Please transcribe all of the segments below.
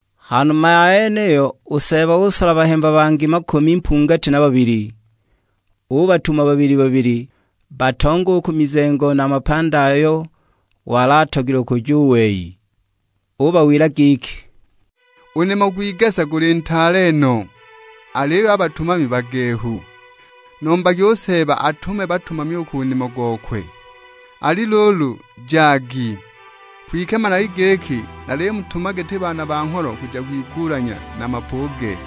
Ha numa ya yeniyo u Seeba usola bahemba bangi makumi mpungati na babili, ubatuma babili-babili, batonge u ku mizengo na a mapandi ayo wali atogilwe kuja u wei. Ubawila giki, "U nimo gw'igesa guli ntaale no, aliyo a batumami bagehu; nombagi u Seeba atume batumami u ku nimo gokwe. Ali luulu, jagi; kwike managi giki nalimutuma giti baana ba ngholo kuja kwigulanya na mapuge!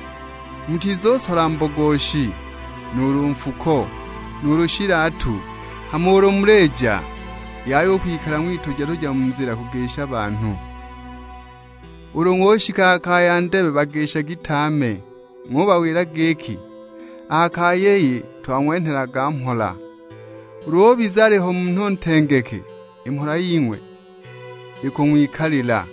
Mutizusola mbogoshi, nuulu nfuko, nuulu shilatu; hama ulu mulija, yaya u kwikala ng'wituja-tuja mu nzila kugisha banhu. Ulu ng'ushika ha kaya ndebe bagishagi tame; ng'ubawila giki, 'A ha kaya iyi, twang'wenhelaga mhola.' Ulu ubiza aliho munhu ntengeke, i mhola ying'we ikung'wikalila;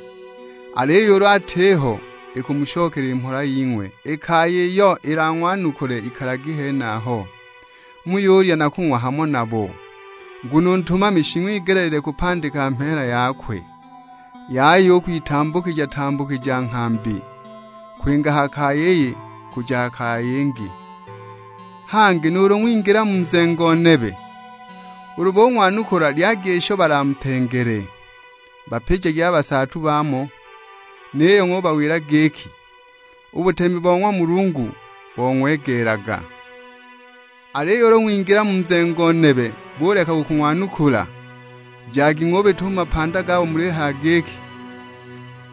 aliyo ulu atiho, ikumushokela i mhola ying'we. I kaya iyo ilang'wanukule ikalagi henaho, muyulya na kung'wa hamo nabo, nguno u ntumami shing'wigelile kupandika mheela yakwe. Yaya u kwitambukija-tambukija nghambi; kwinga ha kaya iyi kuja kaya yingi. Hangi nuulu ng'wingila mu nzengo nebe, ulu bung'wanukula lyagi isho balamutengele. Bapijagi a basaatu baamo, niyo ng'ubawila giki, 'U butemi bo ng'wa Mulungu bong'wegeelaga.' Aliyo ulu ng'wingila mu nzengo nebe buleka u kung'wanukula, jagi ng'ubita u mu mapanda gabo mulihaya giki,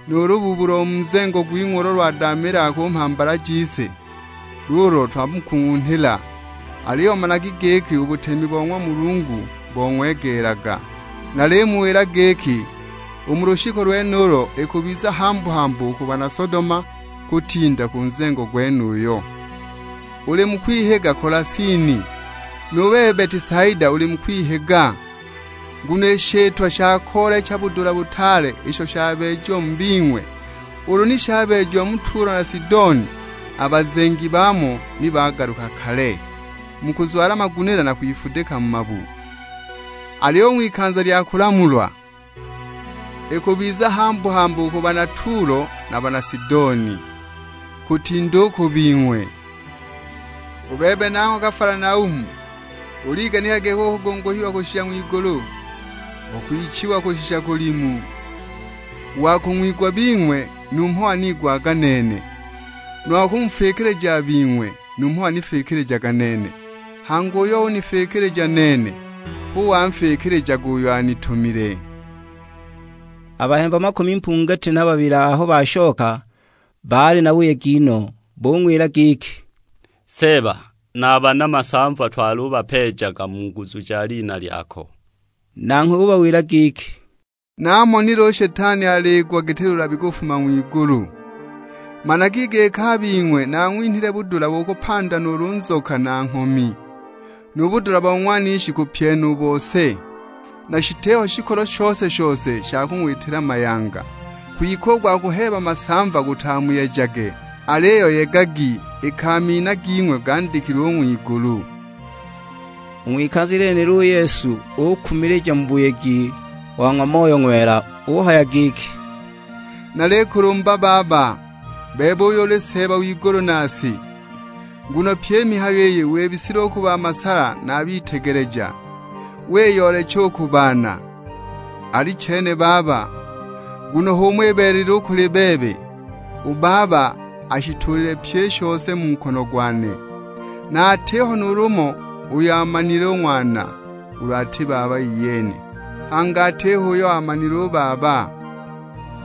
'Nu lubuubu lo mu nzengo gwing'we ulo lwadaamiilaga ku mhambala jise luulo twamukung'unhila, aliyo managi giki u butemi bo ng'wa Mulungu bong'wegeelaga.' Nalimuwila giki, u mu lushiku lwenulo ikubiza hambu-hambu u ku bana Sodoma; kutinda u ku nzengo gwenuyo!" "Uli mu kwihiga Kolasini, nu bebe Betisaida uli mu kwihiga, nguno i shitwa sha koolecha budula butaale isho shabeejiwe mu bing'we ulu ni shabeejiwa mu Tulo na Sidoni, a bazengi baamo ni bagaluka kale, mu kuzwala magunila na kwifudika mu mabu. Aliyo u ng'wikanza lya kulamulwa, ikubiza hambu-hambu u ku bana Tulo na a bana Sidoni, kutinda u ku bing'we! U bebe nangho Kafalanaumu, uliganika giki ukugunguhiwa kushisha ng'wigulu? Ukwichiwa kushisha kulimu! U wa kung'wigwa a bing'we numho waniigwaga nene, nu wa kumufikilija a bing'we numho wanifikilijaga nene; hangi uyo unifikilija nene, hu wanfikilijaga uyo anitumile." A bahemba makumi mpungati na babili aho bashoka baali na buyegi no; bung'wila giki, "Seeba, na a bana masamva twalubapeejaga mu nguzu ja lina lyako." Nanghwe ubawila giki, "Namonile u Shetani aliigwa giti lulabi alifuma ng'wigulu! Managi giki a bing'we naang'winhile budula bo kupanda nuulu nzoka na nghomi, nu budula bo ng'wanishi kubupyena u bose; na shitiho shikolo shose-shose sha kung'witila mayanga. Kwike u gwa kuheeba masamva gutamuyejage, aliyo yegagi iki a mina ging'we gandikilwe u ng'wigulu." U ng'wikanza lyenilo u Yesu ukumilija mu buyegi wa ng'wa Moyo Ng'wela; uhaya giki, "Nalikulumba Baba, bebe uyo uli Seeba w'igulu na si, nguno pyi i mihayo iyi wibisile u ku ba masala na a bitegeleja, wiyoolecha u ku baana. Alichene Baba, nguno h'umo ibeelelile u kuli bebe. U Baba ashituulile pyi i shose mu nkono gwane; na atiho nuulu umo uyo aamanile u Ng'wana, ulu ati Baba iyene. Hangi atiho uyo aamanile u Baba,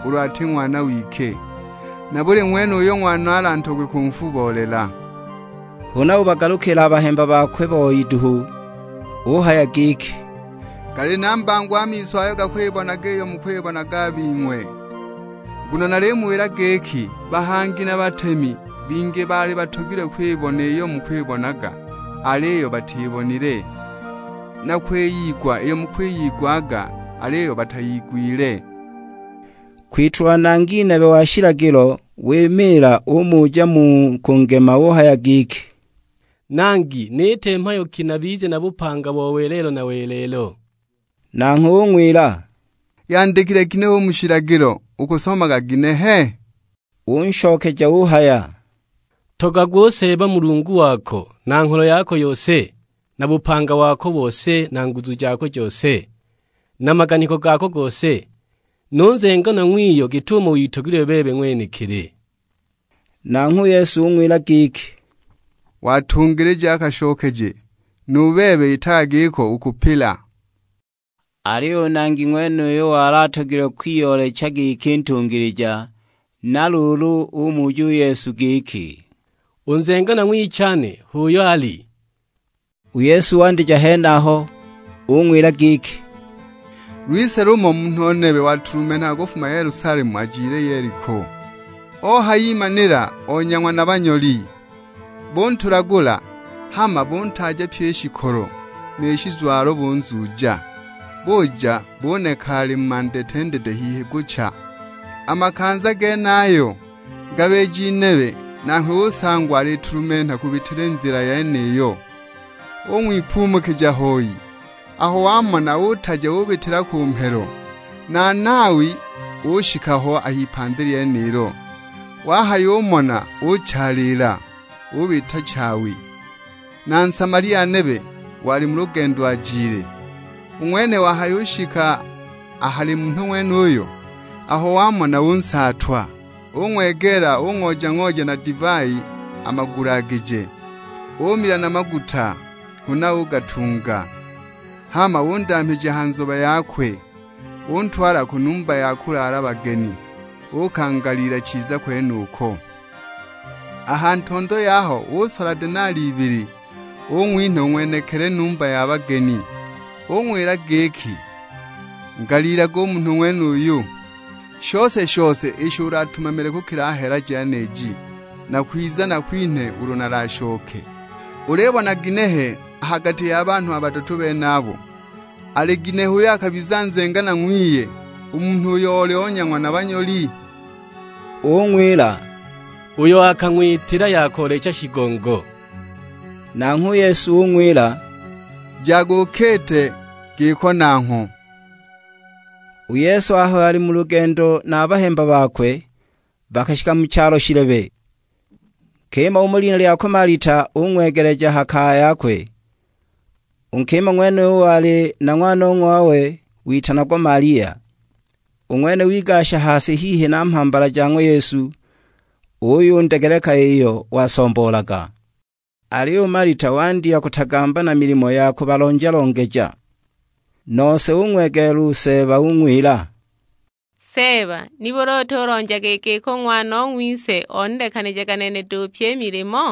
ulu ati Ng'wana wike, na buli ng'wene uyo Ng'wana alatogwe kunfubolela." Huna ubagalukila a bahemba bakwe boi duhu; uhaya giki, "Gali na mbango a miso ayo gakwibonaga iyo mukwibonaga a bing'we. Nguno nalimuwila giki, bahangi na batemi bingi baali batogilwe kwibona iyo mukwibonaga aliyo batibonile; na kwiyigwa iyo mukwiyigwaga aliyo batayigwile." Kwitulwa nangi nebe wa shilagilo wimiila umuja mu kungema, uhaya giki, "Nangi niite mhayo ki nabize na bupanga bo welelo na welelo?" Nanghwe ung'wila, "Yandikilwe ginehe u mu shilagilo, ukusomaga ginehe?" Unshokeja uhaya, "Ntogagwe u Seeba Mulungu wako na ngholo yako yose, na bupanga wako bose na nguzu jako jose, na maganiko gako gose; nu nzenganwa ng'wiyo git'umo witogelilwe bebe ng'wenekili." Nanghwe u Yesu ung'wila giki, "Watungilija a kashokeje, nu bebe itaga giko: ukupila." Aliyo u nangi ng'wenuyo wali atogilwe kwiyoolecha giki ntungilija, na luulu umuja u Yesu giki, "U nzenganwa ng'wichane h'uyo ali?" U Yesu wandija henaho; ung'wila giki, "Lwise lumo munhu nebe watulumenhaga kufuma Yelusalemu ajile Yeliko, ohayimanila onyang'wa na banyoli. Buntulagula, hama buntaaja pyi i shikolo, ni shizwalo bunzuuja, buja buneka ali mandetendete, hihi gucha! A makanza genayo, ngabiji nebe nanghwe usangwa alitulumenha kubitila i nzila yeniyo. Ung'wipumukija hoi, aho wamona utaja ubitila ku mhelo. Na Nawi ushika ho a h'ipandi lyenilo, wahayumona uchaaliila, ubita chaawi. Na Nsamalia nebe wali mu lugendo ajile, u ng'wene wahayushika a hali munhu ng'wenuyo, aho wamona unsaatwa. Ung'wegeela ung'ooja-ooja na divai a magulagije, umila na maguta, huna ugatunga; hama undamhija ha nzobe yakwe, untwala ku numba ya kulaala bageni uukangaliila chiza kwenuko. A ha ntondo yaho usola denali ibili, ung'winha u ng'wenekili numba ya bageni, ung'wila giki, 'Ngaliilage u munhu ng'wenuyu; shose-shose isho ulatumamile kukila a ha hela jeniji, nakwiza nakwinhe ulu nalashoke.' Ulibona ginehe a ha gati ya banhu a badatu benabo, ali ginehe uyo akabiza nzenganwa ng'wiye u munhu uyo oli onyang'wa na banyoli?" Ung'wila, "Uyo akang'witila ya koolecha shigongo." Nanghwe u Yesu ung'wila, "Jaga ukiite giko nangho!" U Yesu aho ali mu lugendo na a bahemba bakwe, bakashika mu chalo shilebe. Nkima umo lina lyakwe Malita ung'wegeleja ha kaya yakwe. U nkima ng'wenuyo wali na ng'wanong'wawe witanagwa Malia. U ng'wene wigasha ha si hihi na mhambala ja ng'wa Yesu, uyundegeleka iyo wasomboolaga. Aliyo u Malita wandya kutagamba na milimo ya kubalonja-longeja. Nose ung'wegeela u Seeba ung'wila, "Seeba, nibuli utulonjaga i giki u ng'wanong'wise onilekanijaga nene duhu pyi i milimo?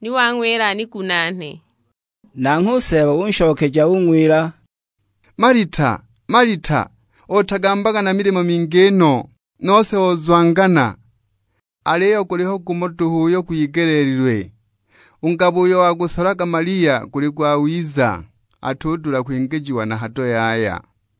Ni wang'wila anigunaane!" Nanghwe u Seeba unshokeja ung'wila, "Malita, Malita, otagambaga na milimo mingi no, nose ozwangana. Aliyo guliho gumo duhu uyo gwigeleelilwe; u ngabo uyo wagusolaga Malia guli gwawiza, atudula kwingijiwa na hado yaya!"